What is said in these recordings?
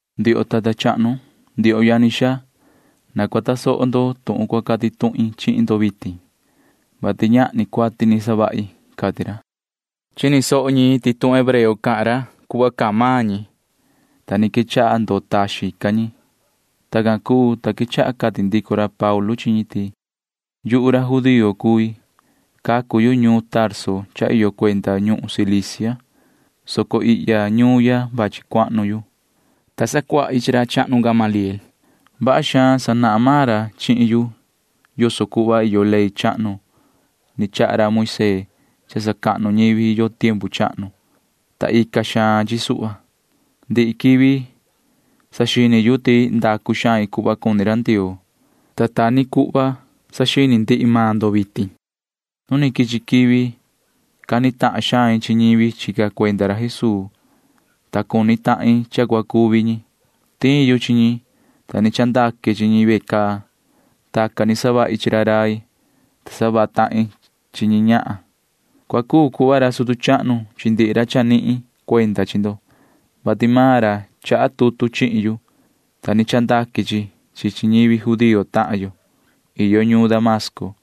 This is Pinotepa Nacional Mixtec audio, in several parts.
―Ndioho tata chahnu, ndioho yani xaa, na cua tasoho ndo tuhun cua cati tuhin chihin ndo vitin, vati ñahni cuati ni savahi ―cati ra. Chini soho ñi ti tuhun hebreo cahan ra [cuhva ni cahan maan ñi], ta ni quechaha ndoo taxin ca ñi. Tacan cuu, ta quechaha cati ndico ra Paulu chi ñi ti: ―Yuhu ra judío cui. Cacu yu ñuun Tarso cha iyo cuenda ñuhun Cilicia, soco ihya ñuun ya vachi cuahnu yu, ta sacuahi chi ra chahnu Gamaliel. Vaha xaan sanahan maan ra chihin yu yoso cuhva iyo ley chahnu ni chaha ra Moisee cha sacahnu ñivi yo tiempu chahnu, ta ica xaan chi suhva. Ndihi quivi saxini yu ti ndacu xain cuhva cuni ra Ndioo, ta ta ni cuhva saxini ndihi maan ndo vitin. Nu ni quichi quivi cani tahan xain chi ñivi chica cuenda ra Jesuu, ta cuni tahin cha cua cuvi ñi. Tiin yu chi ñi, ta ni chandaque chi ñi ve caa. Tacan ni savahi chi ra rai, ta savaha tahin chi chi chi ñi ñahan. Cua cuu cuhva ra sutu chahnu chi ndihi ra chanihin cuenda chi ndo, vati maan ra chaha tutu chihin yu, ta ni chandaque chi chi chi ñivi judío tahan yo iyo ñuun Damasco.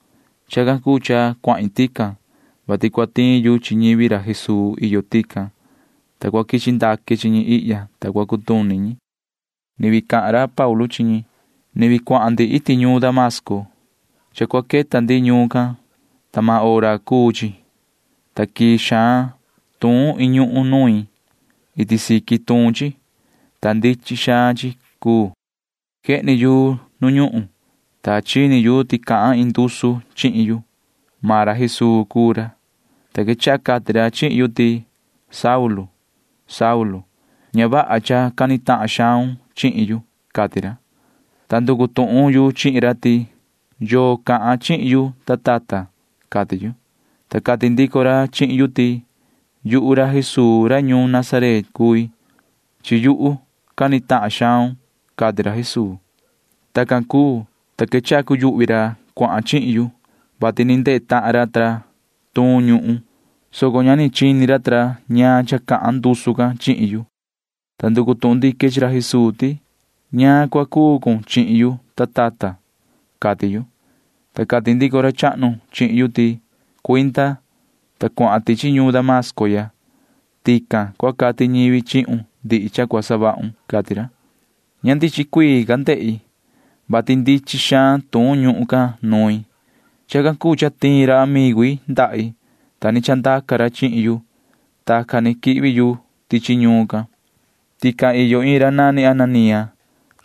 Chacan cuu cha cuahin tican, vati cua tiin yu chi ñivi ra Jesuu iyo tican, ta cua quichi ndaque chi ñi ihya, ta cua cutuni ñi. [Ni vii cahan ra Paulu chi ñi:] ’Ni vii cuahan ndi iti ñuun Damasco. Cha cua queta ndi ñuun can, ta maan hora cuu chi, ta quii xaan tuun iin ñuhun nuin. Iti siqui tuun chi, ta ndichin xaan chi cuu. Quehni yu nu ñuhun, ta chini yu ti cahan iin ndusu chihin yu. Maan ra Jesuu cuu ra, ta quechaha cati ra chihin yu ti: “Yoho Saulu, ña vaha cha cani tahan xaun chihin yu,” cati ra, ta nducu tuhun yu chihin ra ti: “¿Yoo cahan chihin yu, ta tata?” cati yu, ta cati ndico ra chihin yu ti: “Yuhu ra Jesuu ra ñuun Nazaret cui. Chi yuhu cani tahan xaun,” cati ra Jesuu. Tacan cuu, ta quechaha cuyuhvi ra chica chihin yu, vati ni ndehe tahan ra cha tuun ñuhun, soco ña ni chini ra ñaan cha cahan ndusu can chihin yu, ta nducu tuhun ndique chi ra Jesuu ti: “¿Ñaan cua cuu cun chihin yu, ta tata?” cati yu, ta cati ndico ra chahnu chihin yu ti: “Cuinda, ta cuahan tichi ñuun Damasco ya. Tican cua cati ñivi chihun ndihi cha cua savahun,” cati ra. Ña ndichin cuii ni ca ndehi, vati ndichin xaan tuun ñuhun can nuin. Chacan cuu cha tiin ra amigu i ndahi, ta ni chandaca ra chihin yu. Tacan ni quihvi yu tichi ñuun can. ’Tican iyo iin ra nani Ananía,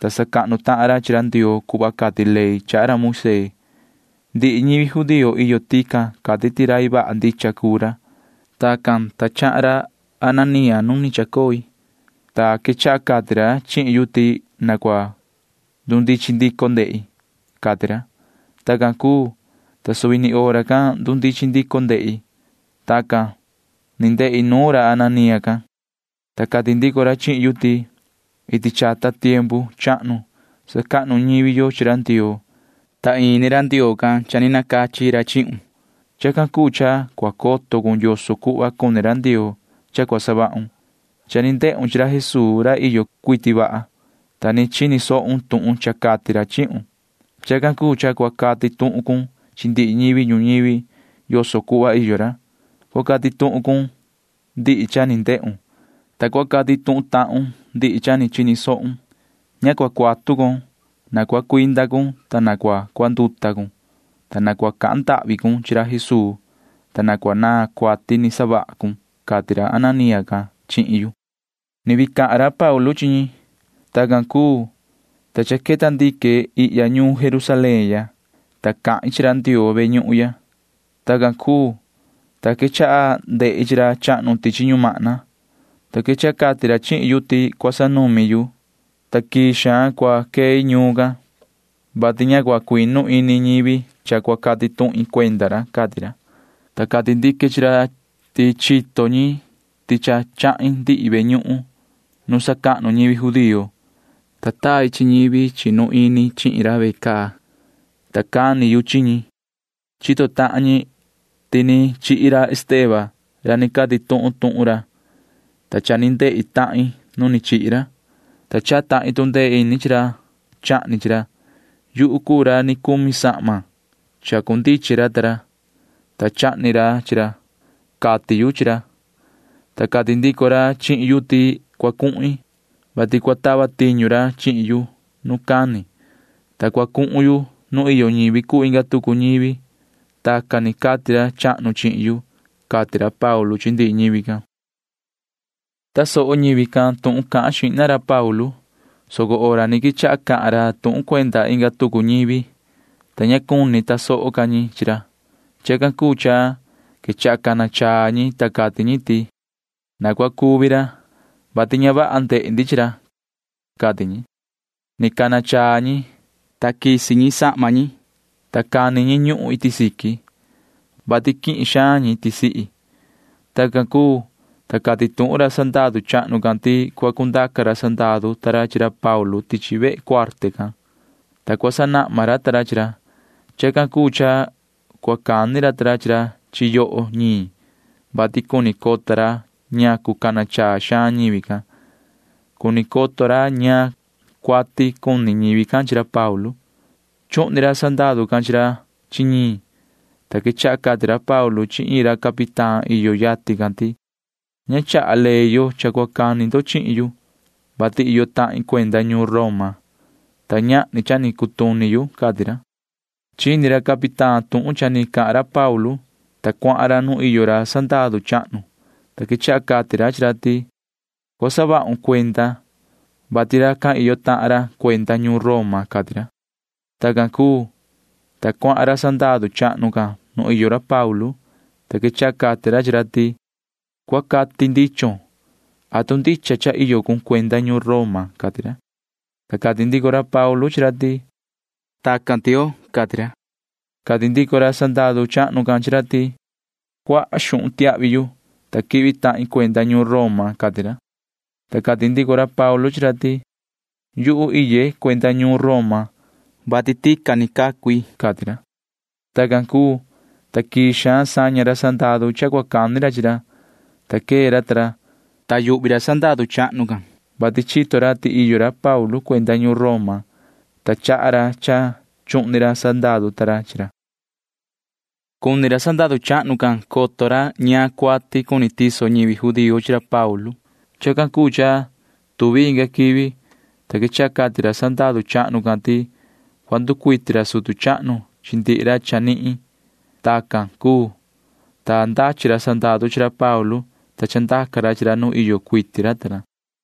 ta sacahnu tahan ra chi ra Ndioo cuhva cati ley chaha ra Moisee. Ndihi ñivi judío iyo tican cati ti rai vaha ndicha cuu ra. Tacan, ta chahan ra Ananía nu ni chacoi, ta quechaha cati ra chihin yu ti na cua ndundichin ndico ndehi, cati ra. Tacan cuu, ta suvi ni hora can ndundichin ndico ndehi. Tacan ni ndehi nuun ra Ananía can, ta cati ndico ra chihin yu ti: “Iti chata tiempu chahnu sacahnu ñivi yo chi ra Ndioo, ta ini ra Ndioo can cha ni nacachi ra chihun. Chacan cuu cha cua coto cun yoso cuhva cuni ra Ndioo cha cua savahun. Cha ni ndehun chi ra Jesuu ra iyo cuiti vaha, ta ni chini sohun tuhun cha cati ra chihun. Chacan cuu cha cua cati tuhun cun chi ndihi ñivi ñuñivi yoso cuhva iyo ra. Cua cati tuhun cun ndihi cha ni ndehun, ta cua cati tuhun tahun ndihi cha ni chini sohun. Ña cua cuatu con. Na cua cuinda cun, ta na cua cuanduta cun, ta na cua cahan ndahvi cun chi ra Jesuu, ta cua naan cuati ni savaha cun,” cati ra Ananía can chihin yu. [Ni vii cahan ra Paulu chi ñi:] ’Tacan cuu, ta cha queta ndique ihya ñuun Jerusalén ya, ta cahin chi ra Ndioo ve ñuhun ya. Tacan cuu, ta quechaha ndehi chi ra chahnu tichi ñumahna, ta quechaha cati ra chihin yu ti cua sanumi yu, ta quii xaan cua quei ñuun ya, vati ña cua cuinu ini ñivi can cha cua cati tuhin cuenda ra, cati ra, ta cati ndique chi ra ti chito ñi ti cha chahin ndihi ve ñuhun nu sacahnu ñivi judío, ta tai chi ñivi chinu ini chihin ra ve caa, ta cani yu chi ñi. Chito tahan ñi ti ni chihi ra Esteban ra ni cati tuhun tuhun ra, ta cha ni ndehe tahin nu chihi ra, ta chaha tahin tu ndee ini chi ra chahni chi ra. Yuhu cuu ra ni cumi sahma chacundichin ra ta ra, ta chahni ra chi ra, cati yu chi ra, ta cati ndico ra chihin yu ti cua cuhin, vati cua tava tiñu ra chihin yu nu cani, ta cua cuhun yu nu iyo ñivi cuu inga tucu ñivi. Tacan ni cati ra chahnu chihin yu ―cati ra Paulu chi ndihi ñivi can. Tasoho ñivi can tuhun cahan xihna ra Paulu, soco hora ni quechaha cahan ra tuhun cuenda inga tucu ñivi, ta ña cuni tasoho ca ñi chi ra. Chacan cuu cha quechaha cana chaa ñi, ta cati ñi ti: ―Na cua cuvi ra, vati ña vaha ndehe ndi chi ra ―cati ñi. Ni cana chaa ñi, ta satati ñi sahma ñi, ta cani ñi ñuhun iti siqui, [vati quihin xaan ñi tisihi]. Tacan cuu, ta cati tuhun ra sandaru chahnu can ti cua cundaca ra sandaru ta ra chi ra Paulu tichi vehe cuarte can, ta cua sanahma ra ta ra chi ra. Chacan cuu cha cua cani ra ta ra chi ra chi yoho ñiin, vati cuni coto ra ñacu cana chaa xaan ñivi can. Cuni coto ra ñaan cuati cuni ñivi can chi ra Paulu. Chuhni ra sandaru can chi ra chi ñiin, ta quechaha cati ra Paulu chi iin ra capitán iyo yatin can ti: ―Ña chaha ley yo cha cua cani ndo chihin yu, vati iyo tahin cuenda ñuun Roma, ta ñahni cha ni cutuni yu ―cati ra. Chini ra capitán tuhun cha ni cahan ra Paulu, ta cuahan ra nu iyo ra sandaru chahnu, ta quechaha cati ra chi ra ti: ―Cua saha vahun cuenda, vati racan iyo tahan ra cuenda ñuun Roma ―cati ra. Tacan cuu, ta cuahan ra sandaru chahnu can nu iyo ra Paulu, ta quechaha cati ra chi ra ti: ―Cua cati ndichon. ¿Atu ndicha cha iyo cun cuenda ñuun Roma? ―cati ra. Ta cati ndico ra Paulu chi ra ti: ―Tacan tioo ―cati ra. Cati ndico ra sandaru chahnu can chi ra ti: ―Cuaha xuhun tiahvi yu, ta quihvi tahin cuenda ñuun Roma ―cati ra. Ta cati ndico ra Paulu chi ra ti: ―Yuhu iye cuenda ñuun Roma, vati tacan ni cacu i ―cati ra. Tacan cuu, ta quii xaan saña ra sandaru cha cua cani ra chi ra, ta quee ra ta ra, ta yuhvi ra sandaru chahnu can suhva, vati chito ra ti iyo ra Paulu cuenda ñuun Roma, ta chaha ra cha chuhni ra sandaru ta ra chi ra. Cuni ra sandaru chahnu can coto ra ñaan cuati ndicha cuni tiso ñivi judío chi ra Paulu. Chacan cuu cha tuvi inga quivi, ta quechaha cati ra sandaru chahnu can ti cua nducuiti ra sutu chahnu chi ndihi ra chanihin. Tacan cuu, ta ndachi ra sandaru chi ra Paulu, ta chandaca ra chi ra nu iyo cuiti ra ta ra.